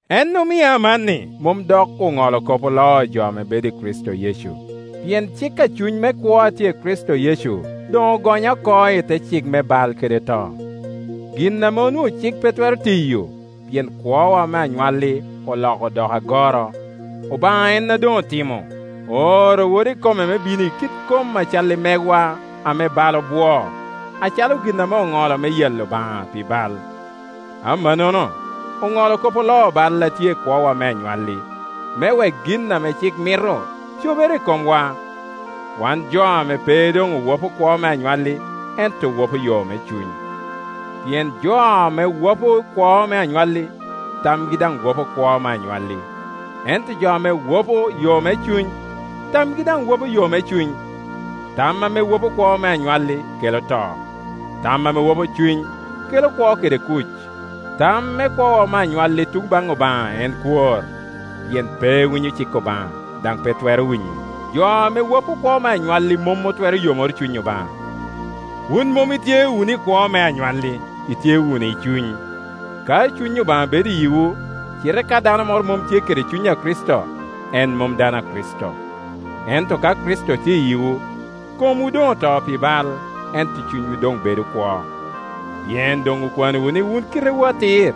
En omio amanni mom dok oŋolo kop oloo jo ame bedo i Kricito Yecu. Pien cik a Cuny me kwo a tye i Kricito Yecu doŋogonya oko i te cik me bal kede to. Gin ame onwoŋo cik pe twero tiyo, pien kwowa me anywalli oloko odoko agoro, Obaŋa en a doŋotimo. Ooro Wode ikome me bino i kit kom a cal i megwa ame bal obwoo, acalo gin ame oŋolo me yalo Obaŋa pi bal. Amannono oŋolo kop oloo bal a tye i kwowa me anywalli, me wek gin ame cik mito cobere i komwa, wan jo ame pe doŋowapo kwowa me anywalli, ento owopo yo me Cuny. Pien jo ame wopo kwo me anywalli, tamgi daŋ wopo kwo me anywalli; ento jo ame wapo yo me Cuny, tamgi daŋ wa po yo me Cuny. Tam ame wopo kwo me anywalli kela to; tam ame wopo Cuny kela kwo kede kuc. Tam me kwowa me anywalli i tun baŋ Obaŋa en kwor, pien pe winyo cik Obaŋa, daŋ pe twero winyo. Jo ame wopo kwo me anywalli mom otwero yomoro cuny Obaŋa. Wun mom itye wunu i kwo me anywalli, itye wunu i Cuny, ka Cuny Obaŋa bedo i yiwu. Cite ka dano moro mom tye kede Cuny a Kricito, en mom dano a Kricito. Ento ka Kricito tye i yiwu, komwu doŋoto pi bal, ento cunywu doŋbedo kwo, pien doŋokwanowu ni wun kitewu atir.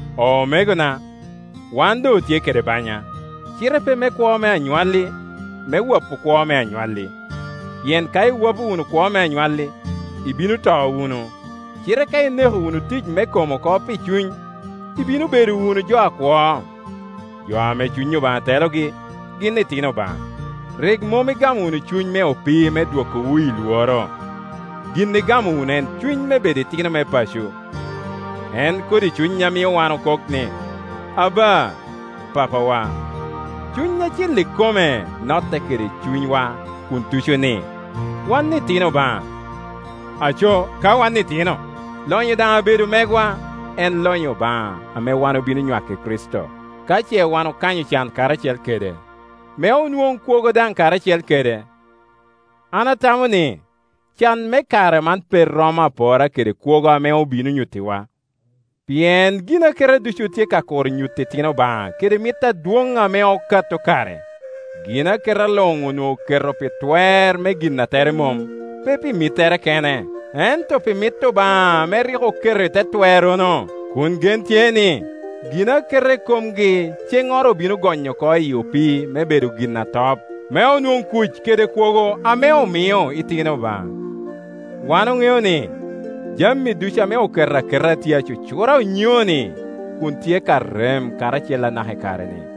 Omegona, wan doŋotye kede banya, cite pe me kwo me anywalli, me wopo kwo me anywalli. Pien ka iwopo wunu kwo me anywalli, ibino to wunu; cite ka ineko wunu tic me kom oko pi Cuny, ibino bedo wunu jo akwo. Jo ame Cuny Obaŋa telogi, gin itino Obaŋa. Rik mom igamo wunu cuny me opii me dwokowu i lworo; gin igamo wunu en cuny me bedo itino me paco, en kodi cuny a mio wan okok ni, “Aba! Papawa!” Cuny Acil ikome notte kede cunywa kun tuco ni, wan iti no Obaŋa. Aco, ka wan itino, lonyo daŋ abedo megwa, en lonyo Obaŋa ame wan obino nywako i Kricito, ka ce wan okanyo can karacel kede, me onwoŋ kwogo daŋ karacel kede. An atamo ni, can me kare man pe romo apora kede kwogo ame obino nyuttiwa. Pien ginaketa ducu tye ka kuro nyuto itino Obaŋa kede mit adwoŋ ame okato kare. Ginaketa luŋonwoŋo oketo i te twer me gin a tere mom, pe pi mittere kene, ento pi mit Obaŋa ame rik oketo i te twerrono; kun gen tye ni, ginaketa ikomgi ceŋŋoro obino gonyo oko i opii me bedo gin atop, me onwoŋ kuc kede kwogo ame omio itino Obaŋa. Wan oŋeo ni, jami ducu ame oketo aketa tye acucura onyoni kun tye ka rem karacel anaka i kare-ni.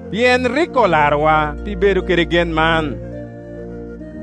Pien rik olarowa pi bedo kede gen man.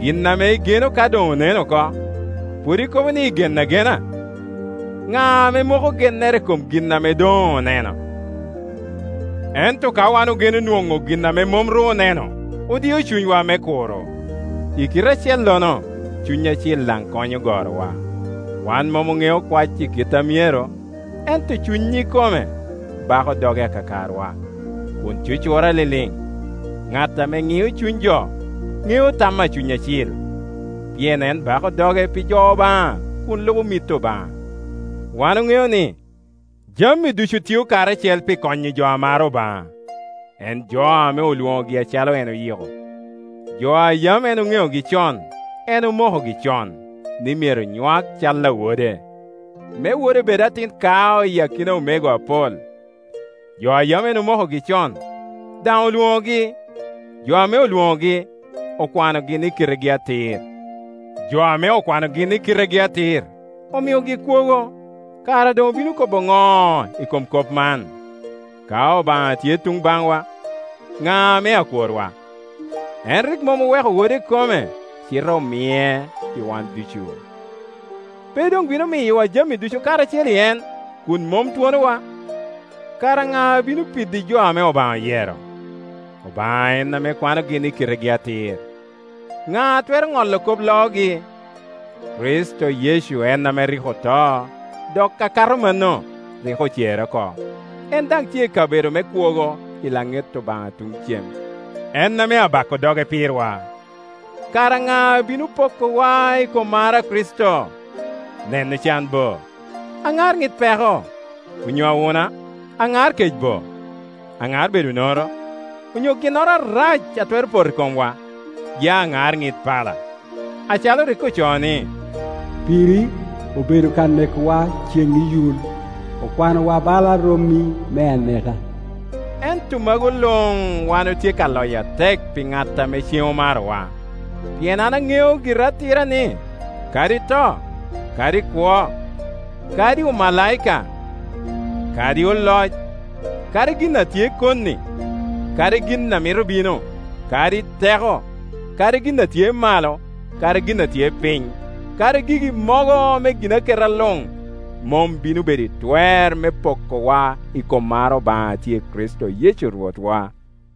Gin ame igeno ka doŋonen oko, pwod ikobo ni igeno agena? Ŋa ame moko gennere i kom gin ame doŋoneno? Ento ka wan ogeno nwoŋo gin ame mom ru oneno, odio cunywa me kuro. I kite acellono Cuny Acil daŋ konyo gorowa. Wan mom oŋeo kwac i kite a myero, ento Cuny ikome bako doge akakarwa, kun cucura liliŋ. Ŋat ame ŋio cuny Jo ŋeo tam a Cuny Acil, pien en bako doge pi jo Obaŋa kun lubo mit Obaŋa. Wan oŋeo ni, jami ducu tio karacel pi konyo jo a maro Obaŋa, en jo ame olwoŋogi acalo en oyiko. Jo a yam en oŋeogi con, en omokogi con, ni myero nywak cal a Wode, me Wode bed atin kao i akina omego apol. Jo a yam en omokogi con, daŋ olwoŋogi; jo ame olwoŋogi, okwanogi ni kitegi atir; jo ame okwanogi ni kitegi atir, omiogi kwogo. Kara doŋobino kobo ŋo i kom kop man? Ka Obaŋa tye luŋ baŋwa, ŋa ame akworwa? En rik mom oweko Wode ikome, cite omie pi wan ducu. Pe doŋbino miyowa jami ducu karacel i en, kun mom twonowa? Kara ŋa a bino piddi jo ame Obaŋa oyero? Obaŋa en ame kwanogi ni kitegi atir. Ŋa a twero ŋolo kop loogi? Kricito Yecu en ame rik oto, dok akato mano, rik ocere oko. En daŋ tye i kabedo me kwogo i laŋet Obaŋa tuŋ cem, en ame abako doge pirwa. Kara ŋa a bino pokowa i kom mar a Kricito? Neno can bo, aŋar ŋit peko, onyo awuna, aŋar kecbo, aŋar bedo onoro, onyo ginnoro arac a twero poto i komwa, ya aŋar ŋit pala? Acalo rik ocoo ni, “Piri obedo ka nekowa ceŋ iyul; okwanowa bala romi me aneka.” Ento magu luŋwan otye ka loyo atek pi ŋat a ceŋ omarowa. Pien an aŋeo gira atira ni, kadi to, kadi kwo, kadi omalaika, kadi oloc, kadi gin a tye koni, kadi gin a mito bino, kadi teko, kadi gin a tye malo, kadi gin a tye piny, kadi gigi mogo me ginaketa luŋ, mom bino bedo i twer me pokowa i kom mar Obaŋa a tye i Kricito Yecu Rwotwa.